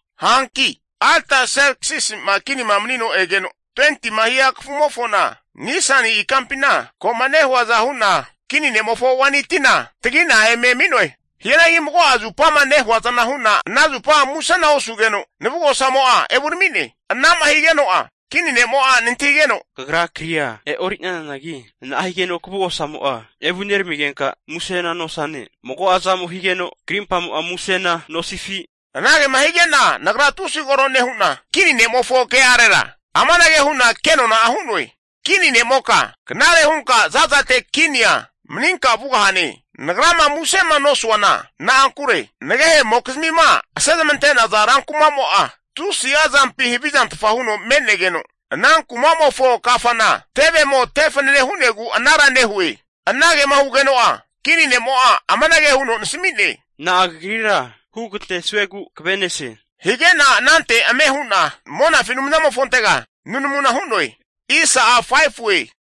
Hanki Artserksisi'ma kinima manino egeno 20tima hia kafumofona Nisani ikampina, ko'ma nehuaza hu'na kini ne'mofo waini tina tagi'na eme ami'noe. Hianagi mago'a zupama nehuazana hu'na ana zupa musena osugeno navugosamo'a evurami'ne. Ana'ma higeno'a kini ne'mo'a nantahigeno, Kagra kria e'ori'nananagi na'a higeno kavugosamo'a evuneramigenka musena nosane? Mago'a zamo higeno krimpamo'a musena nosifi? Anagema hige'na nagra tusi koro nehu'na, kini ne'mofo ke'arera amanage hu'na kenona'a hu'noe, kini ne'moka knare hunka za'zate kinia maninka vugahane. Nagrama musema nosuana na'ankure, nagehe'mokizmima asezamante'naza rankuma'mo'a tusi'a zampi havizantfa huno me'negeno, ana kuma'mofo kafana tevemo tefanane hu'negu anara nehue. Anagema hugeno'a kini nemo'a amanage huno nasami'ne, Na'a kagrira hugantesuegu kave'nesie, hige'na anante ame hu'na monafi Anumzamofontega nunamuna hu'noe.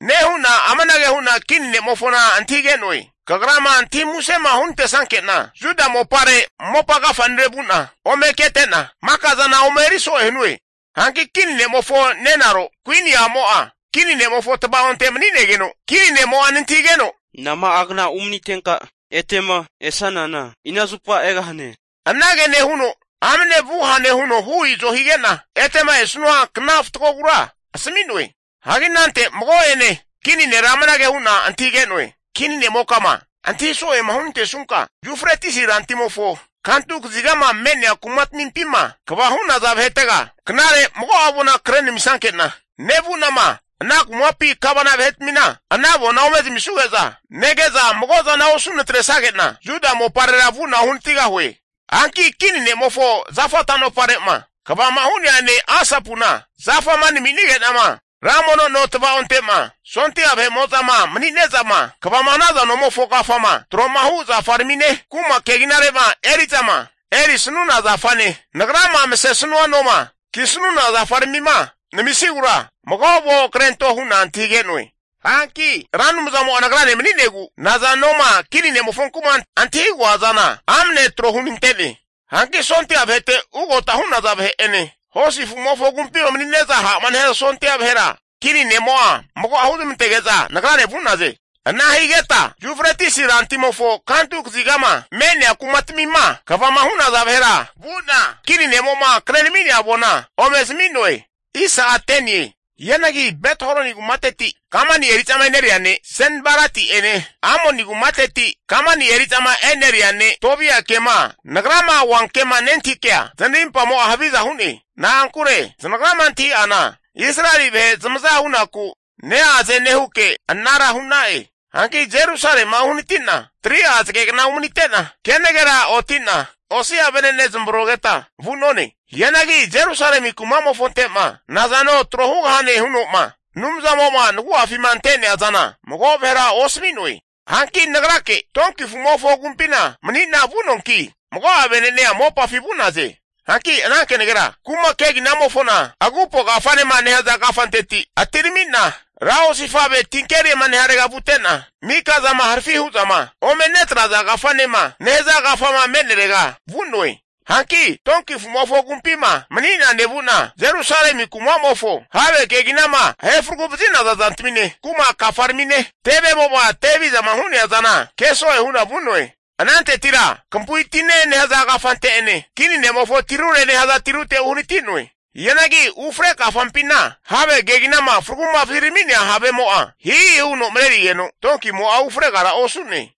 Nehu'na amanage hu'na kini ne'mofona antahige'noe, kagrama antahi musema hunantesnanke'na Juda mopare mopa agafa'nire vu'na ome kete'na, maka'zana ome eri so'e hanue. Hanki kini ne'mofo nenaro kuini a'mo'a kini nemofo tava'onte mani'negeno kini ne'mo'a nantahigeno, nama'a kna umanitenka etema esanana ina zupa egahane? Anage nehuno amne vugahane huno hu izo hige'na, etema esanua kna fatgogura asami'noe. Hagi anante mago'ene kini nera amanage hu'na antahige'noe, Kini ne'mokama antahi so'ema hunantesnunka, Yufretisi rantimofo kantu kazigama me'nea kumatmimpima kva hu'naza vahetega knare mago'a avona kre namisnanke'na, nevu'nama ana kumapi gavana vahetamina ana avona ome zamisanuge'za, nege'za mago'zana osu natresage'na Juda moparera vu'na uhanatigahue. Hanki kini ne'mofo zafa tanopare'ma kvama hu'nea ne' Asapuna, zafama naminige'nama ra mono no tvaonte'ma, sondia vahe'ma mani'nezama kvama hanaza nomofo kafama tro'ma hu zafaramine kuma keginare'ma eri'zama erisanuna zafane nagrama masesanua noma kisanuna zafaramima namisigura, mago avon krento hu'na antahige'noe. Hanki Ra Anumzamo'a nagrane mani'negu nazanoma kini ne'mofonku'ma antahigoa zana amne tro hunante'ne. Hanki sondia vahete ugota hu'naza vahe'ene hosi afu'mofo agumpima mani'nezama ha'ma nehaza sondia vahera kini ne'mo'a mago'a huzmantege'za nagrane vu'naze. Ana higeta Yufretisi rantimofo kantu kazigama me'nea kumatmima kvama hu'naza vahera vu'na kini ne'mo'ma krenami'nea avona ome zami'noe. Hianagi Bet-Horoni kumateti kamani eri'zama eneria ne' Senbalati'ene, Amoni kumateti kamani eri'za eneria ne' Tobia'enema nagrama oanke'ma nentahikea zanarinpamo'a haviza hu'ne. Na'ankure zanagrama antahi'ana Israeli vahe zamaza hunaku neaze nehuke anara hu'na'e. Hanki Jerusalema uhanati'na 3'a zagegna umanite'na, kenagera otina osi'a venene zamavrogeta vu'none. Hianagi Jerusalemi kuma'mofonte'ma nazano tro hugahane huno'ma Anumzamo'ma nagu'afima ante'nea zana mago vahera osami'noe. Hanki nagrake tonki afu'mofo agumpina mani'na vu'noanki, mago'a vene'nea mopafi vu'naze. Hanki ana kenagera kuma keginamofona, Agupo Kafanema nehaza kafanteti atirami'na, Ra Osifave tinkerima nehazarega vute'na, Mikazama Harafi hu'zama ome netraza kafanema nehaza kafama me'nerega vu'noe. Hanki tonki afu'mofo agumpima mani'na nevu'na, Jerusalemi kuma'mofo have keginama ahefragu vazi'naza zantamine, kuma kafaramine tevemo'ma te havizama hu'nea zana keso'e hu'na vu'noe. Anantetira Kampu'i Tine nehaza kafante'ene, Kini Nemofo tirure nehaza tirute uhanati'noe. Hianagi ufre kafampina have keginama fragu'ma vazirami'nea havemo'a hihi huno mareri'negeno tonkimo'a ufregara osu'ne.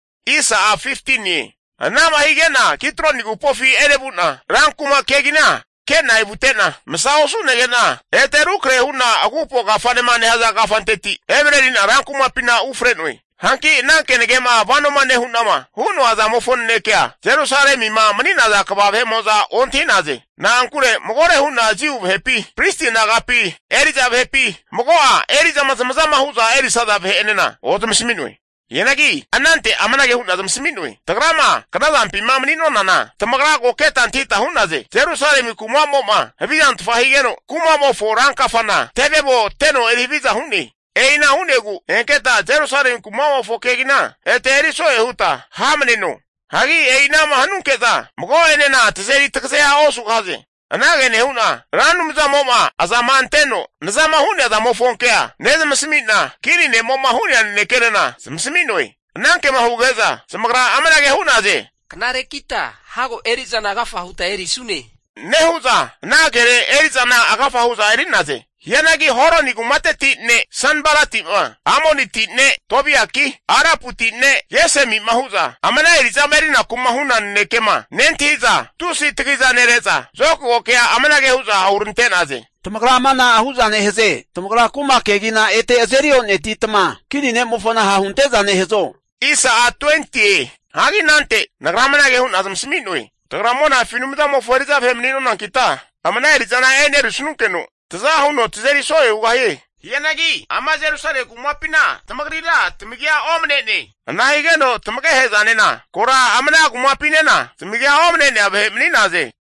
Anama hige'na Kidroni agupofi enevu'na ran kuma kegina ke'na evute'na, masa osu nege'na ete rukrahe hu'na Agupo Kafanema nehaza kafanteti emareri'na ran kumapina ufre'noe. Hanki ana kenage'ma vanoma nehu'nama hu'noa zamofo nanekea, Jerusalemima mani'naza kva vahe'mo'za ontahi'naze. Na'ankure magore hu'na Jiu vahepi, pristi nagapi eri'za vahepi mago'a eri'zama zamazama hu'za erisaza vahe'enena ozamasami'noe. Hianagi anante amanage hu'na zamasami'noe, Tagrama knazampima mani'nonana tamagra ko keta antahita hu'naze. Jerusalemi kuma'mo'ma havizantfa higeno, kumamofo rankafana tevemo teno eri haviza hu'ne. E'ina hu'negu enketa Jerusalemi kuma'mofo kegina ete eriso'e huta hamaneno. Hagi e'inama hanunke'za mago'enena tazeri tagazea osugahaze. Anage nehu'na Ra Anumzamo'ma azama anteno nazama hu'nea zamofo kea nezamasami'na, kini ne'mo'ma hu'nea nanekenena zamasami'noe. Anankema huge'za zamagra amanage hu'naze, Knarekita hago eri'zana agafa huta erisune, nehu'za, ana kere eri'zana agafa hu'za eri'naze. Hianagi Horoni kumateti ne' Sanbalati'ma, Amoniti ne' Tobiaki, Araputi ne' Gesemi'ma hu'za amana eri'zama eriku'ma huna nanekema nentahi'za, tusi tagiza nere'za zokago kea amanage hu'za hurante'naze, tamagra ama na'a hu'za nehaze? Tamagra kuma kegina ete azeri o'netitma, kini ne'mofona ha' hunte'za nehazo? Hagi anante nagra amanage hu'na zamasami'noe, tagra monafi Anumzamofo eri'za vahe mani'nonankita ama ana eri'zana enerisanunkeno, taza huno tazeri so'ea hugahie. Hianagi ama Jerusalemi kumapina tamagrira tamagia omane'ne. Ana higeno tamagehe'zanena kora ama kumapinena zamagia omane'nea vahe mani'naze.